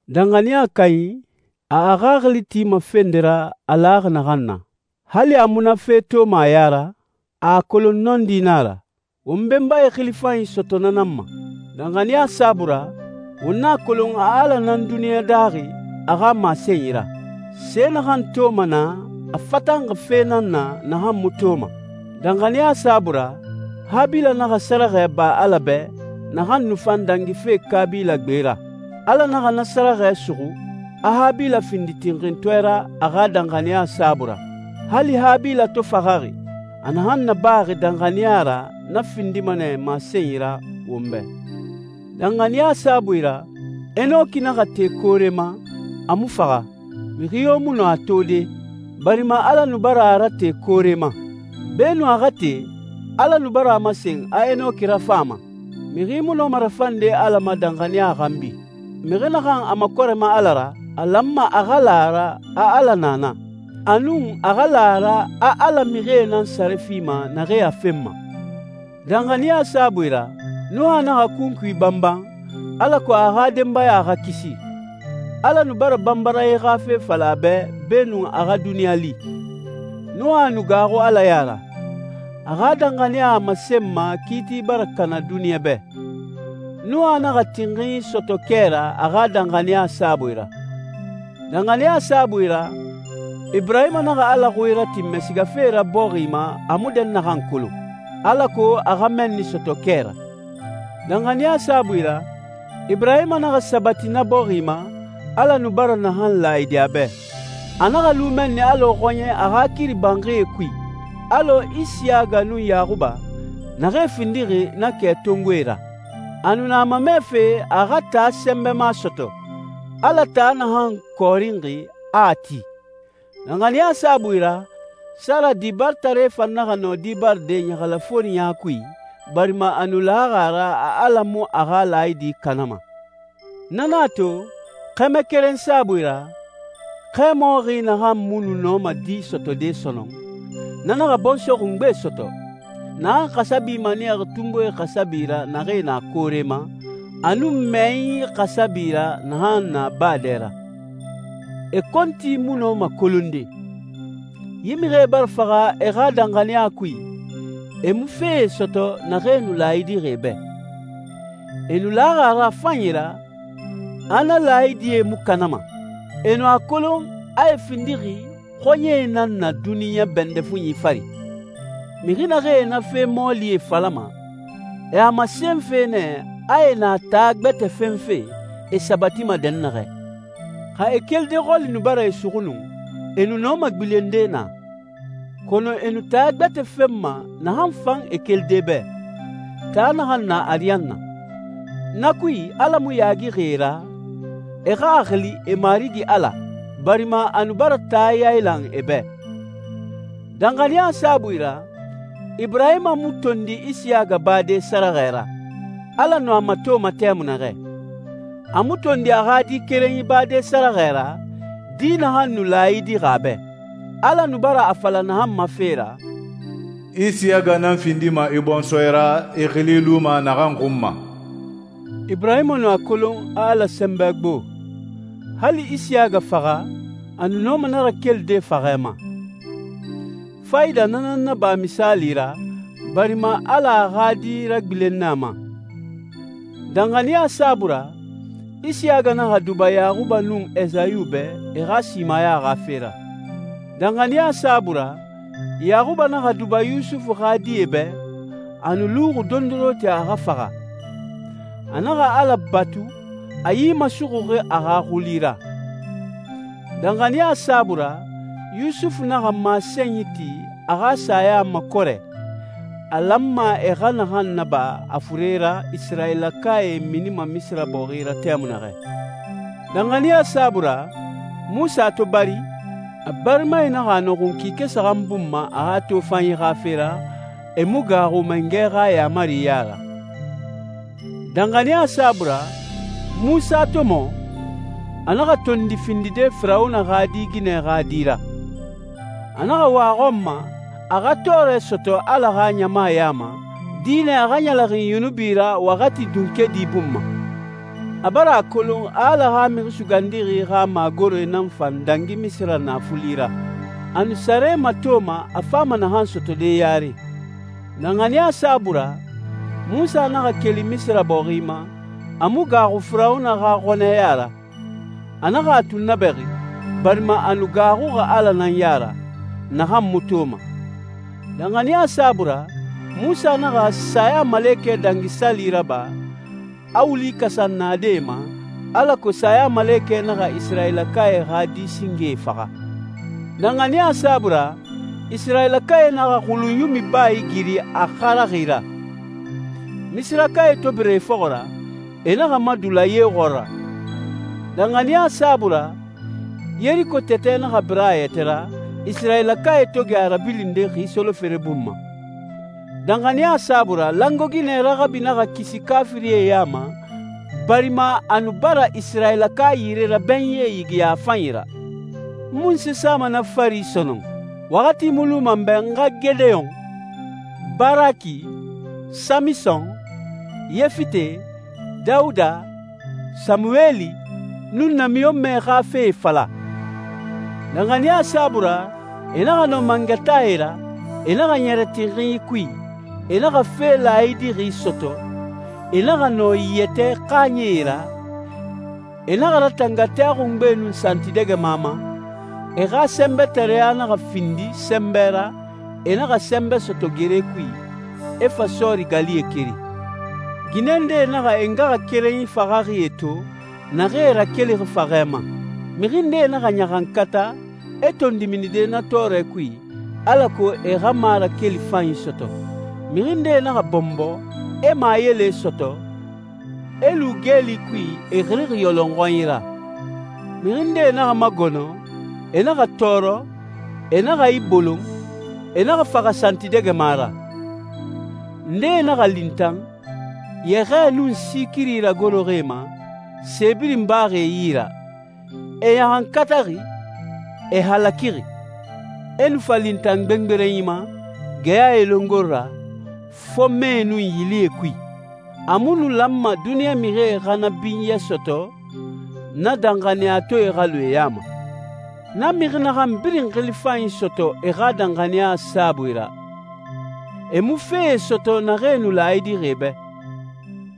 Danxaniya kanyi, a a xaxili tima fe nde ra a laxi naxan na. Hali a mu na fe toma a ya ra, a a kolon nɔndi nan a ra. Won benbae xili fanyi sɔtɔ na nan ma. Danxaniya saabui ra, won a kolon a Ala nan duniɲa daaxi a xa masenyi ra. Se naxan toma naa a fatanxi fe nan na naxan mu toma. Danxaniya saabui ra, Habila naxa sɛrɛxɛ ba Ala bɛ naxan nu fan dangife Kabila gbe ra. Ala naxa na sɛrɛxɛ suxu, a Habila findi tinxintɔɛ ra a xa danxaniya saabui ra. Hali Habila to faxaxi, a naxan nabaxi danxaniya ra na findima nɛ masenyi ra won bɛ. Danxaniya saabui ra, Enoki naxa te koore ma, a mu faxa. Mixi yo mu nɔ a tode, barima Ala nu bara a rate koore ma. Beenun a xa te, Ala nu bara a masen a Enoki rafan a ma. Mixi mu nɔma rafande Ala ma danxaniya xanbi. Mixi naxan a makɔrɛma Ala ra, a lanma a xa la a ra a Ala na na, a nun a xa la a ra a Ala mixie nan sare fima naxee a fenma. Danxaniya saabui ra, Nuha naxa kunkui banban alako a xa denbaya xa kisi. Ala nu bara banbaranyi xa fe fala a bɛ beenun a xa duniɲa li. Nuha nu gaaxu Ala ya ra. A xa danxaniya a masenma kiiti bara kana duniɲa bɛ. Nuha naxa tinxinyi sɔtɔ kɛ ra a xa danxaniya saabui ra. Danxaniya saabui ra, Iburahima naxa Ala xui ratinmɛ sigafe ra bɔxi ma a mu dɛnnaxan kolon, alako a xa mɛnni sɔtɔ kɛ ra. Danxaniya saabui ra, Iburahima naxa sabati na bɔxi ma, Ala nu bara naxan laayidi a bɛ. A naxa lu mɛnni alɔ xɔɲɛ a xa kiri banxie kui, alɔ Isiyaga nun Yaxuba, naxee findixi na kɛtongoe ra. A nu na a mamɛfe a xa taa sɛnbɛma sɔtɔ, Ala taa naxan kɔɔrinxi, a a ti. Danxaniya saabui ra, Sara dibaritare fan naxa nɔ di baride ɲɛlɛxɛforiɲa kui, barima a nu laxi a ra a Ala mu a xa laayidi kanama. Na nan a to, xɛmɛ keren saabui ra, xɛmɔxi naxan mu nu nɔma di sɔtɔde sɔnɔn, na naxa bɔnsɔɛ xungbe sɔtɔ, «naxan xasabi maniyaxi tunbuie xasabi ra naxee na koore ma, a nun mɛyɛnyi xasabi ra naxan na baa dɛ ra. E kɔnti mu nɔma kolonde.» Yi mixie bara faxa e xa danxaniya kui, e mu fee sɔtɔ naxee nu laayidixi e bɛ. E nu laxi a ra a fanyi ra, a na laayidie mu kanama. E nu a kolon a e findixi «xɔɲɛe nan na duniɲa bɛndɛ fuɲi fari.» Mixi naxee na fe mɔɔlie falama, e a masenfe nɛ a e na taa gbɛtɛ fenfe e sabatima dɛnnaxɛ. Xa e kelide xɔli nu bara e suxu nu, e nu nɔma gbilende naa. Kɔnɔ e nu taa gbɛtɛ fenma naxan fan e kelide bɛ, taa naxan na ariyanna. Na kui, Ala mu yaagixi e ra, e xa a xili e Marigi Ala, barima a nu bara taa yailan e bɛ. Danxaniya saabui ra, Iburahima mu tondi Isiyaga bade sɛrɛxɛ ra, Ala nu a matoma tɛmui naxɛ. A mu tondi a xa di kerenyi bade sɛrɛxɛ ra, di naxan nu laayidixi a bɛ, Ala nu bara a fala naxan ma fe ra, «Isiyaga nan findima i bɔnsɔɛ ra, i xili luma naxan xun ma.» Iburahima nu a kolon a Ala sɛnbɛ gbo, hali Isiyaga faxa, a nu nɔma na rakelide faxɛ ma. Fayida na nan naba misaali ra, barima Ala a xa di ragbilen nɛ a ma. Danxaniya saabui ra, Isiyaga naxa duba Yaxuba nun Esayu bɛ e xa simaya xa fe ra. Danxaniya saabui ra, Yaxuba naxa duba Yusufu xa die bɛ, a nu luxi dondoronti a xa faxa. A naxa Ala batu, a yi masuxuxi a xa xuli ra. Danxaniya saabui ra, Yusufu naxa masenyi ti a xa saya makɔrɛ, a lanma e xa naxan naba a fure ra Isirayilakae minima Misira bɔxi ra tɛmui naxɛ. Danxaniya saabui ra, Munsa to bari, a barimae naxa a nɔxun kike saxan bun ma a xa tofanyi xa fe ra, e mu gaaxu mangɛ xa yaamari ya ra. Danxaniya saabui ra, Munsa to mɔ, a naxa tondi findide Firawuna xa di ginɛ xa di ra. A naxa wa a xɔn ma, a xa tɔɔrɛ sɔtɔ Ala xa ɲama ya ma, dinɛ a xa ɲɛlɛxin yunubi ra waxati dunkedi bun ma. A bara a kolon Ala xa Mixi Sugandixi xa magore nan fan dangi Misira naafuli ra. A nu sare matoma a fama naxan sɔtɔde yare. Danxaniya saabui ra, Munsa naxa keli Misira bɔxi ma, a mu gaaxu Firawuna xa xɔnɛ ya ra. A naxa a tunnabɛxi, barima a nu gaaxuxi Ala nan ya ra, naxan mu toma. Danxaniya saabui ra, Munsa naxa Sayamalekɛ Dangi Sali raba, a wuli kasan naadɛe ma, alako sayamalekɛ naxa Isirayilakae xa di singee faxa. Danxaniya saabui ra, Isirayilakae naxa Xulunyumi baa igiri a xaraxi ra. Misirakae to bira e fɔxɔ ra, e naxa madula ye xɔɔra. Danxaniya saabui ra, Yeriko tɛtɛ naxa bira a yɛtɛ ra, Isirayilakae to gɛ a rabilinde xi solofere bun ma. Danxaniya saabui ra, langoe ginɛ Raxabi naxa kisi kaafirie ya ma, barima a nu bara Isirayilaka yire rabɛnyie yigiya a fanyi ra. N munse sama na fari sɔnɔn? Waxati mu luma n bɛ n xa Gedeyon, Baraki, Samison, Yefite, Dawuda, Samuweli, nun namiɲɔnmɛe xa fee fala. Danxaniya saabui ra, e naxa nɔ mangataae ra, e naxa ɲɛrɛ tinxinyi kui, e naxa fe laayidixi sɔtɔ, e naxa nɔ yɛtɛ xaaɲɛe ra, e naxa ratanga tɛ xungbe nun santidɛgɛma ma, e xa sɛnbɛtareya naxa findi sɛnbɛ ra, e naxa sɛnbɛ sɔtɔ gere kui, e fa sɔɔri galie keri. Ginɛ ndee naxa e ngaxakerenyi faxaxie to, naxee rakelixi faxɛ ma. Mixi ndee naxa ɲaxankata, e tondi minide na tɔɔrɛ kui, alako e xa marakeli fanyi sɔtɔ. Mixi ndee naxa bɔnbɔ, e mayele sɔtɔ, e lu geeli kui, e xirixi yɔlɔnxɔnyi ra. Mixi ndee naxa magɔnɔ, e naxa tɔɔrɔ, e naxa a ibolon, e naxa faxa santidɛgɛma ra. Ndee naxa lintan, yɛxɛɛ nun si kiri ragoroxi e ma, se birin baxi e yi ra, e ɲaxankataxi, e halakixi, e nu fa lintan gbengberenyi ma, geyae longori ra, fɔnmɛe nun yilie kui. A mu nu lanma duniɲa mixie xa na binyɛ sɔtɔ na danxaniyatɔɛe xa lu e ya ma. Na mixi naxan birin xili fanyi sɔtɔ e xa danxaniya saabui ra, e mu fee sɔtɔ naxee nu laayidixi e bɛ.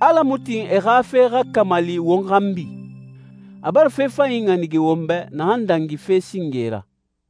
Ala mu tin e xa fe xa kamali won xanbi. A bara fe fanyi ɲanige won bɛ naxan dangi fe singe ra.